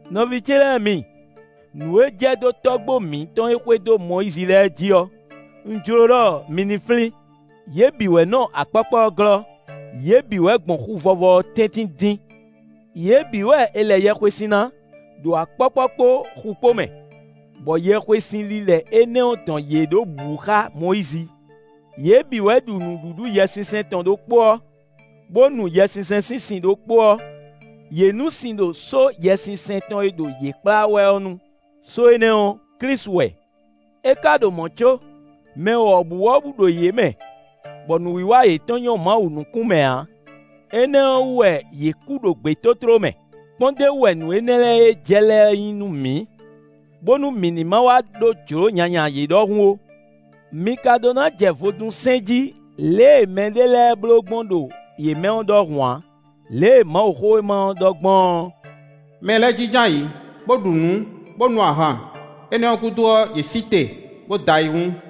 Nɔví ce lɛ́ɛ mi, nǔ e jɛ dó tɔ́gbó mǐtɔn e xwedó Mɔyízi lɛ́ɛ jí ɔ́, un jló ɖɔ mi ní flín. Yě bǐ wɛ nɔ akpɔ́kpɔ́ ɔ́ glɔ́; yě bǐ wɛ gbɔn Xu Vɔvɔ ɔ́ tɛ́ntin dín. Yě bǐ wɛ è lɛ yɛhwesin ná, ɖo akpɔ́kpɔ́ kpó xu kpó mɛ, bɔ yɛhwesin lilɛ énɛ́ ɔ́ dɔn yě ɖó bǔ xá Mɔyízi. Yě bǐ wɛ ɖu nǔɖuɖu Yɛsinsɛn tɔn ɖokpó ɔ́, bó nu Yɛsinsɛn sín sin ɖokpó ɔ́: yě nu sin ɖo só Yɛsinsɛn tɔn e ɖo yě kplá wɛ ɔ́ nu; só énɛ́ ɔ́, Klísu wɛ. É ka ɖo mɔ̌ có, mɛ wɔ̌buwɔ́bú ɖo yě mɛ, bɔ nǔwiwa yětɔn nyɔ́ Mawu nukún mɛ ǎ; énɛ́ ɔ́ wú wɛ yě kú ɖo gbětótló mɛ. Kpɔ́ndéwú wɛ nǔ énɛ́ lɛ́ɛ e jɛ lɛ́ɛ nyí nú mǐ, bónú mǐ ní ma wá ɖó jlǒ nyanya yě ɖɔhun ó. Mi ka ɖó ná jɛ vodún sɛn jí lě e mɛɖé lɛ́ɛ bló gbɔn ɖo yě mɛ ɔ́ ɖɔhun ǎ. Lě e Mawuxówéma ɔ́ ɖɔ gbɔn ɔ́: “Mɛ lɛ́ɛ jínjɔ́n ayǐ, bó ɖu nǔ, bó nu ahan; énɛ́ ɔ́ gúdo ɔ́, yě sí te, bó da ayihún.”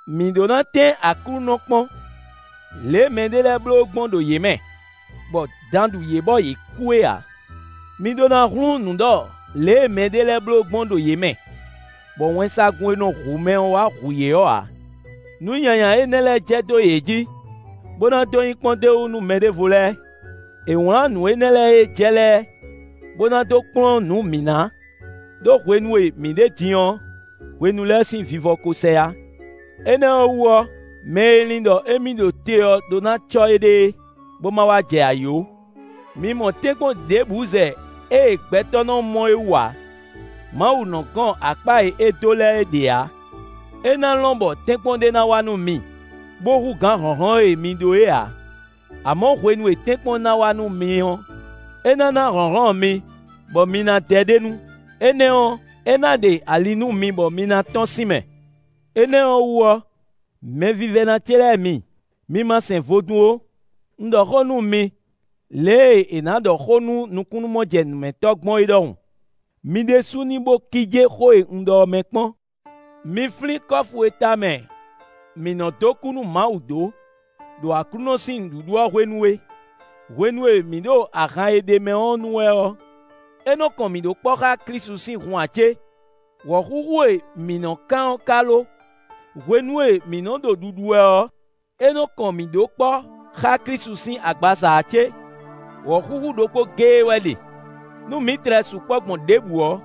Mǐ ɖó ná tɛ́n Aklúnɔ kpɔ́n, lě e mɛɖé lɛ́ɛ bló gbɔn ɖo yě mɛ, bɔ dan ɖu yě bɔ yě kú é ǎ. Mi ɖó ná hlún nǔ ɖɔ lě e mɛɖé lɛ́ɛ bló gbɔn ɖo yě mɛ, bɔ wɛnsagun e nɔ hu mɛ ɔ́ wá hu yě ɔ́ ǎ. Nǔ nyanya énɛ́ lɛ́ɛ jɛ dó yě jǐ, bó ná dó nyí kpɔ́ndéwú nú mɛɖěvo lɛ́ɛ; è wlǎn nǔ énɛ́ lɛ́ɛ e jɛ lɛ́ɛ, bó ná dó kplɔ́n nǔ mǐ ná; ɖó hwenu e mǐ ɖe din ɔ́, hwenu lɛ́ɛ sín vivɔ ko sɛ yá. Énɛ́ ɔ́ wú ɔ́, mɛ e lin ɖɔ émí ɖo te ɔ́ ɖó ná cɔ́ éɖée, bó ma wá jɛ ayǐ ó. Mi mɔ tɛ́nkpɔ́n ɖěbǔ zɛ ée gbɛtɔ́ nɔ mɔ é wú ǎ. Mawu nɔ́ gɔn akpá e é dó lɛ́ɛ ɖe ǎ; é ná lɔn bɔ tɛ́nkpɔ́n ɖé ná wá nú mi bó hú gǎn hlɔ̌nhlɔ́n e mi ɖó é ǎ; amɔ̌ hwenu e tɛ́nkpɔ́n ná wá nú mi ɔ́, é ná ná hlɔ̌nhlɔ́n mi bɔ mi ná dɛ ɖ'é nu; énɛ́ ɔ́, é ná ɖe ali nú mi bɔ mi ná tɔ́n sín mɛ. Énɛ́ ɔ́ wú ɔ́, mɛvívɛ́ná ce lɛ́ɛ mi, mi ma sɛn vodún ó. Un ɖɔ xó nú mi, lě e è nǎ ɖɔ xó nú nukúnnú-mɔjɛnǔmɛtɔ́ gbɔn é ɖɔhun; mi ɖésú ní bo kíjé xó e un ɖɔ ɔ́ mɛ kpɔ́n. Mi flín kɔ́fu e tamɛ mǐ nɔ́ dó kú nú Mawu dó ɖo Aklúnɔ sín nǔɖuɖu ɔ́ hwenu é: hwenu e mǐ ɖo ahan e ɖ'é mɛ ɔ́ nu wɛ ɔ́, é nɔ kɔn mǐ ɖó kpɔ́ xá Klísu sín hun ǎ cé? Wɔ̌xúxú e mǐ nɔ́ kán ɔ́ ka lo? Hwenu e mǐ nɔ́ ɖo ɖuɖu wɛ ɔ́, é nɔ́ kɔn mǐ ɖó kpɔ́ xá Klísu sín agbaza a cé? Wɔ̌xúxú ɖokpó géé wɛ ɖe; nú mǐ tlɛ sukpɔ́ gbɔn ɖěbǔ ɔ́,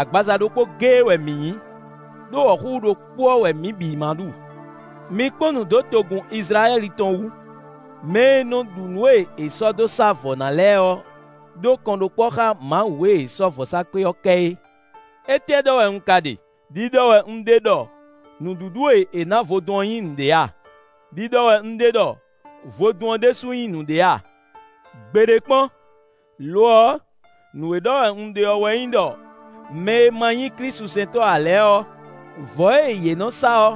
agbaza ɖokpó géé wɛ mǐ nyí, ɖó wɔ̌xúxú ɖokpó ɔ́ wɛ mǐ bǐ má ɖu. Mi kpɔ́n nǔ dó togun Izlayɛ́li tɔn wú: mɛ e nɔ ɖu nǔ e è sɔ́ dó sá vɔ̌ ná lɛ́ɛ ɔ́ ɖó kɔnɖókpɔ́ xá Mawu e è sɔ́ vɔ̌sákpe ɔ́ kɛ é. Étɛ́ ɖɔ wɛ un ka ɖe? Điɖɔ wɛ un ɖe ɖɔ nǔɖuɖu e è nǎ vodún ɔ́ nyí nǔɖé a? Điɖɔ wɛ un ɖe ɖɔ vodún ɔ́ ɖésú nyí nǔɖé a? Gbeɖé kpɔ́n! Lo ɔ́, nǔ e ɖɔ wɛ un ɖe ɔ́ wɛ nyí ɖɔ mɛ e ma nyí klísusɛntɔ́ ǎ lɛ́ɛ ɔ́, vɔ̌ e yě nɔ́ sá ɔ́,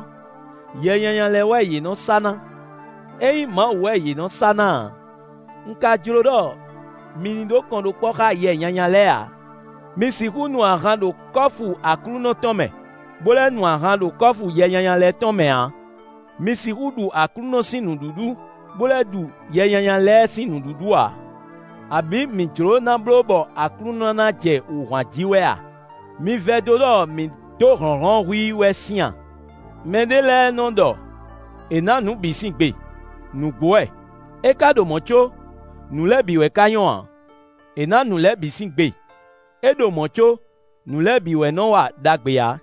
yɛ nyanya lɛ́ɛ wɛ yě nɔ́ sá ná; é nyí Mawu wɛ yě nɔ sá ná ǎ. Un ka jló ɖɔ mi ní ɖó kɔnɖókpɔ́ xá yɛ nyanya lɛ́ɛ ǎ. Mi sixú nu ahan ɖo kɔ́fu Aklúnɔ tɔn mɛ, bó lɛ́ nu ahan ɖo kɔ́fu yɛ nyanya lɛ́ɛ tɔn mɛ ǎ; mi sixú ɖu Aklúnɔ sín nǔɖuɖu, bó lɛ́ ɖu yɛ nyanya lɛ́ɛ sín nǔɖuɖu ǎ. Abǐ mǐ jlǒ ná bló bɔ Aklúnɔ ná jɛ wǔ hwan jí wɛ a? Mi vɛdó ɖɔ mǐ dó hlɔ̌nhlɔ́n hú i wɛ sín a? Mɛ ɖé lɛ́ɛ nɔ ɖɔ: “È nǎ nǔ bǐ sín gbe.” Nǔgbó wɛ! É ka ɖo mɔ̌ có, nǔ lɛ́ɛ bǐ wɛ ka nyɔ́ ǎ. “È nǎ nǔ lɛ́ɛ bǐ sín gbe”; é ɖo mɔ̌ có, nǔ lɛ́ɛ bǐ wɛ nɔ wa ɖagbe ǎ.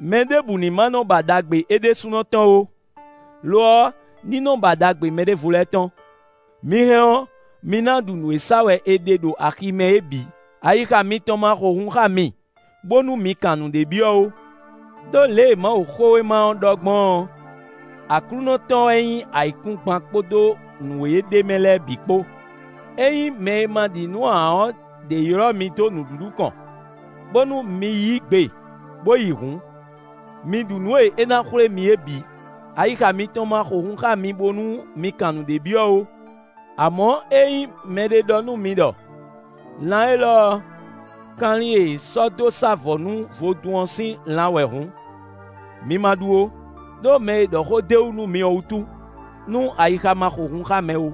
Mɛɖěbǔ ní ma nɔ ba ɖagbe é ɖésúnɔ tɔn ó; lo ɔ́, ní nɔ ba ɖagbe mɛɖěvo lɛ́ɛ tɔn. Mi hɛn ɔ́, mi ná ɖu nǔ e sa wɛ è ɖe ɖo axi mɛ é bǐ; ayixa mitɔn ma xo hun xá mi bónú mi kan nǔɖé byɔ́ ó. Đó lě e Mawuxówéma ɔ́ ɖɔ gbɔn ɔ́: “Aklúnɔ tɔn wɛ nyí ayǐkúngban kpódó nǔ e ɖ'é mɛ lɛ́ɛ bǐ kpó.” Ényí mɛ e ma ɖi nǔ ǎ ɔ́ ɖě ylɔ́ mi dó nǔɖuɖu kɔn, bónú mi yí gbe bo yi hǔn, mi ɖu nǔ e é ná xwlé mi é bǐ; ayixa mitɔn ma xo hun xá mi bónú mi kan nǔɖé byɔ́ ó. Amɔ̌ ényí mɛɖé ɖɔ nú mi ɖɔ: “Lan élɔ́ ɔ́, kanlin e è sɔ́ dó sá vɔ̌ ná nú vodún ɔ́ sín lan wɛ hǔn”, mi ma ɖu ó; ɖó mɛ e ɖɔ xó d'é wú nú mi ɔ́ wútu, nú ayixa ma xo hun xá mɛ ó.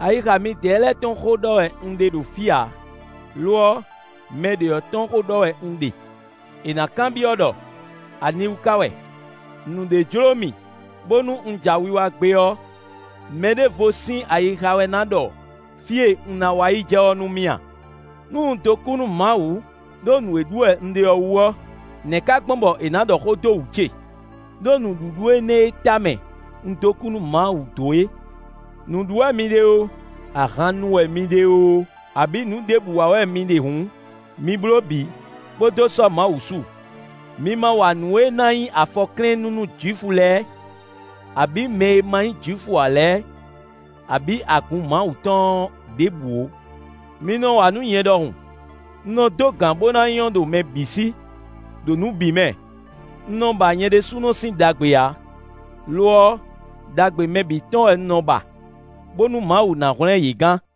Ayixa midɛɛ lɛ́ɛ tɔn xó ɖɔ wɛ un ɖe ɖo fí ǎ; lo ɔ́, mɛ ɖě ɔ́ tɔn xó ɖɔ wɛ un ɖe. È nǎ kanbyɔ́ ɖɔ: “Aniwú ka wɛ? Nǔɖé jlǒ mì bónú un ja wiwa gbé ɔ́, mɛɖěvo sín ayixa wɛ ná ɖɔ fí e un ná wa yi jɛ ɔ́ nú mì a? Nú un dó kú nú Mawu ɖó nǔ e ɖu wɛ un ɖe ɔ́ wú ɔ́, nɛ̌ ka gbɔn bɔ è nǎ ɖɔ xó dó wǔ ce, ɖó nǔɖuɖu énɛ́ e tamɛ un dó kú nú Mawu dó é?” Nǔ ɖu wɛ mi ɖe oo, ahan nu wɛ mi ɖe oo, abǐ nǔ ɖěbǔ wa wɛ mi ɖe hǔn, mi bló bǐ, bó dó sɔ́ Mawu su. Mi ma wa nǔ e ná nyí afɔklɛ́nnú nú Jwifu lɛ́ɛ, abǐ mɛ e ma nyí Jwifu ǎ lɛ́ɛ, abǐ agun Mawu tɔn ɔ́ ɖěbǔ ó. Mi nɔ wa nǔ nyɛ ɖɔhun; un nɔ dó gǎn bó ná nyɔ́ ɖo mɛ bǐ sí, ɖo nǔ bǐ mɛ; un nɔ ba nyɛ ɖésúnɔ sín ɖagbe ǎ; lo ɔ́, ɖagbe mɛ bǐ tɔn wɛ un nɔ ba, bónú Mawu ná hwlɛ́n yě gán.